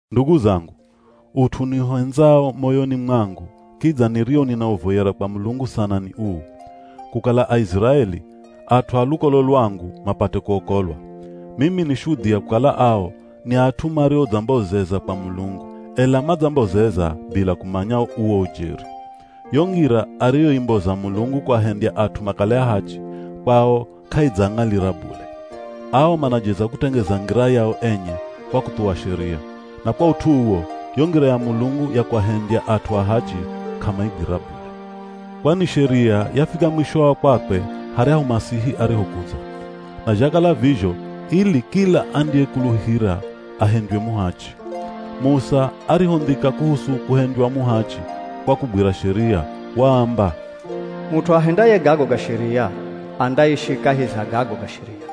Ndugu zangu, ut'u niuhendzao moyoni mwangu, kidza nirio ninauvoyera kwa Mulungu sana ni uu: kukala Aiziraeli, at'u a lukolo lwangu mapate kuokolwa. Mimi ni shudhia kukala ao ni at'u mariodzambozeza kwa Mulungu, ela madzambozeza bila kumanya uwo ujeri. Yo ngira ariyoimboza Mulungu kuahendya at'u makale ahachi, kwao k'aidzaang'alira bule. Ao manajeza kutengeza ngira yao enye kwa kuthuwa Sheria. Na kwa ut'u uwo, yo ngira ya Mulungu ya kuahendya at'u ahachi k'amaigwira bule. Kwani Sheria yafika mwisho wa kwakwe haryahu Masihi arihokudza. Na zhakala vizho ili kila andiyekuluhira ahendywe muhachi. Musa arihondhika kuhusu kuhendywa muhachi kwa kugwira Sheria, waamba, “Mut'u ahendaye gago ga Sheria, andaishi kahi za gago ga Sheria.”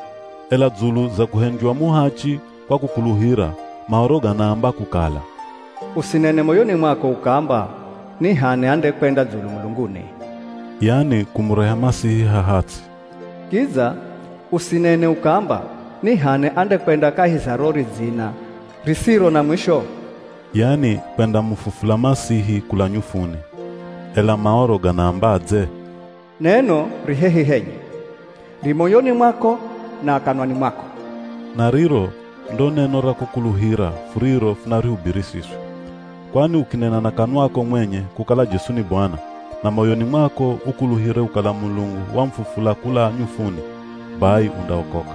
Ela dzulu za kuhendywa muhachi kwa kukuluhira, Maoro ganaamba kukala, “Usinene moyoni mwako ukaamba, ‘Ni h'ani andekwenda dzulu mulunguni?’” (Yani kumureha Masihi haha ts'i). “Kidza usinene ukaamba, ‘Ni h'ani andekwenda kahi za ro ridzina risiro na mwisho?’” (Yani kwendamufufula Masihi kula nyufuni). Ela Maoro ganaambadze? “Neno ri hehi henye, ri moyoni mwako na kanwani mwako.” Na riro ndo neno ra kukuluhira furiro funarihubiri siswi. Kwani ukinena na kanwako mwenye kukala Jesu ni Bwana, na moyoni mwako ukuluhire kukala Mulungu wamufufula kula nyufuni, bai undaokoka.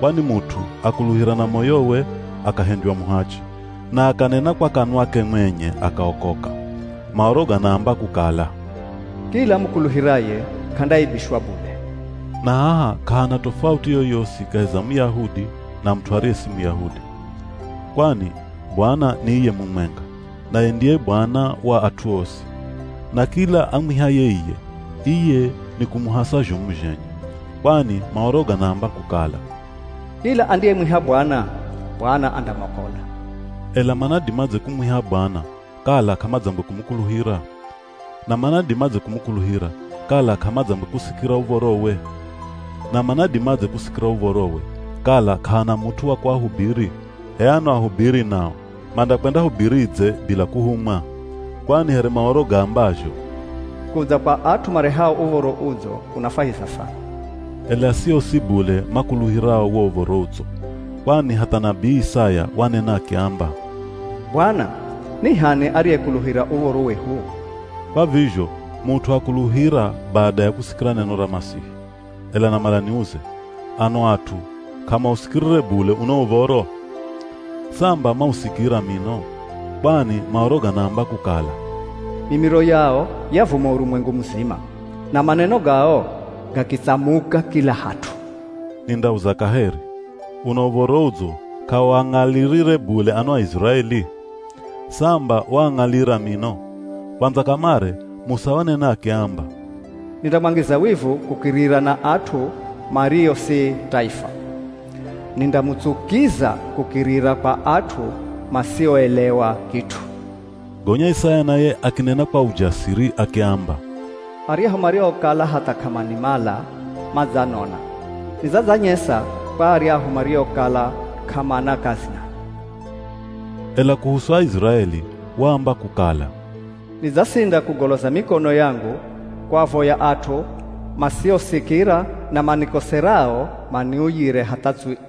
Kwani mut'u akuluhira na moyowe akahendywa muhachi, na akanena kwa kanwake mwenye akaokoka. Maoro ganaamba kukala, “Kila amukuluhiraye, k'andaaibishwa bule.” Na haha k'ahana tofauti yoyosi kahi za Muyahudi, na mut'u ariye si Muyahudi. Kwani Bwana ni iye mumwenga, naye ndiye Bwana wa at'u osi. Na kila amwihaye iye, iye nikumuhasa zhomu zhenye. Kwani Maoro ganaamba kukala, “Kila andiyemwiha Bwana, Bwana andamwakola.” Ela manadimadze kumwiha Bwana kala k'amadzangwe kumukuluhira? Na manadimadze kumukuluhira kala k'amadzangwe kusikira uv̱orowe? Na manadimadze kusikira uv̱orowe kala k'ahana mut'u wa kuahubiri? H'e ano ahubiri nao mandakwendahubiridze bila kuhumwa? Kwani here Maoro gaambazho, “Kudza kwa at'u marehao Uv̱oro Udzo kunafwahiza sana.” Ela si osi bule makuluhirao wo Uv̱oro Udzo. Kwani hatha nabii Isaya wanena akiamba, “Bwana, ni h'ani ariyekuluhira uv̱oro wehu?” Kwa vizho mut'u akuluhira bada ya kusikira neno ra Masihi. Ela namala niuze. Ano at'u k'amausikirire bule uno uv̱oro? Samba mausikira mino. Kwani Maoro ganaamba kukala, “Mimiro yao yavuma urumwengu muzima na maneno gao gakitsamuka kila hat'u.” Nindauza kaheri. Uno Uv̱oro Udzo, k'auang'alirire bule ano Aiziraeli? Samba waang'alira mino. Kwandza kamare Musa wanena akiamba, “Nindamwangiza wivu kukirira na at'u mario si taifa. Nindamutsukiza kukirira kwa at'u masioelewa kit'u.” Gonya Isaya naye akinena kwa ujasiri akiamba, “Aryahu mariokala hatha k'amanimala, madzanona. Nidzadzanyesa kwa aryahu mariokala k'amana kazi nami.” Ela kuhusu Aiziraeli waamba kukala, “Nidzasinda kugoloza mikono yangu kuavoya at'u masiosikira na manikoserao maniuyire hatha tswii.”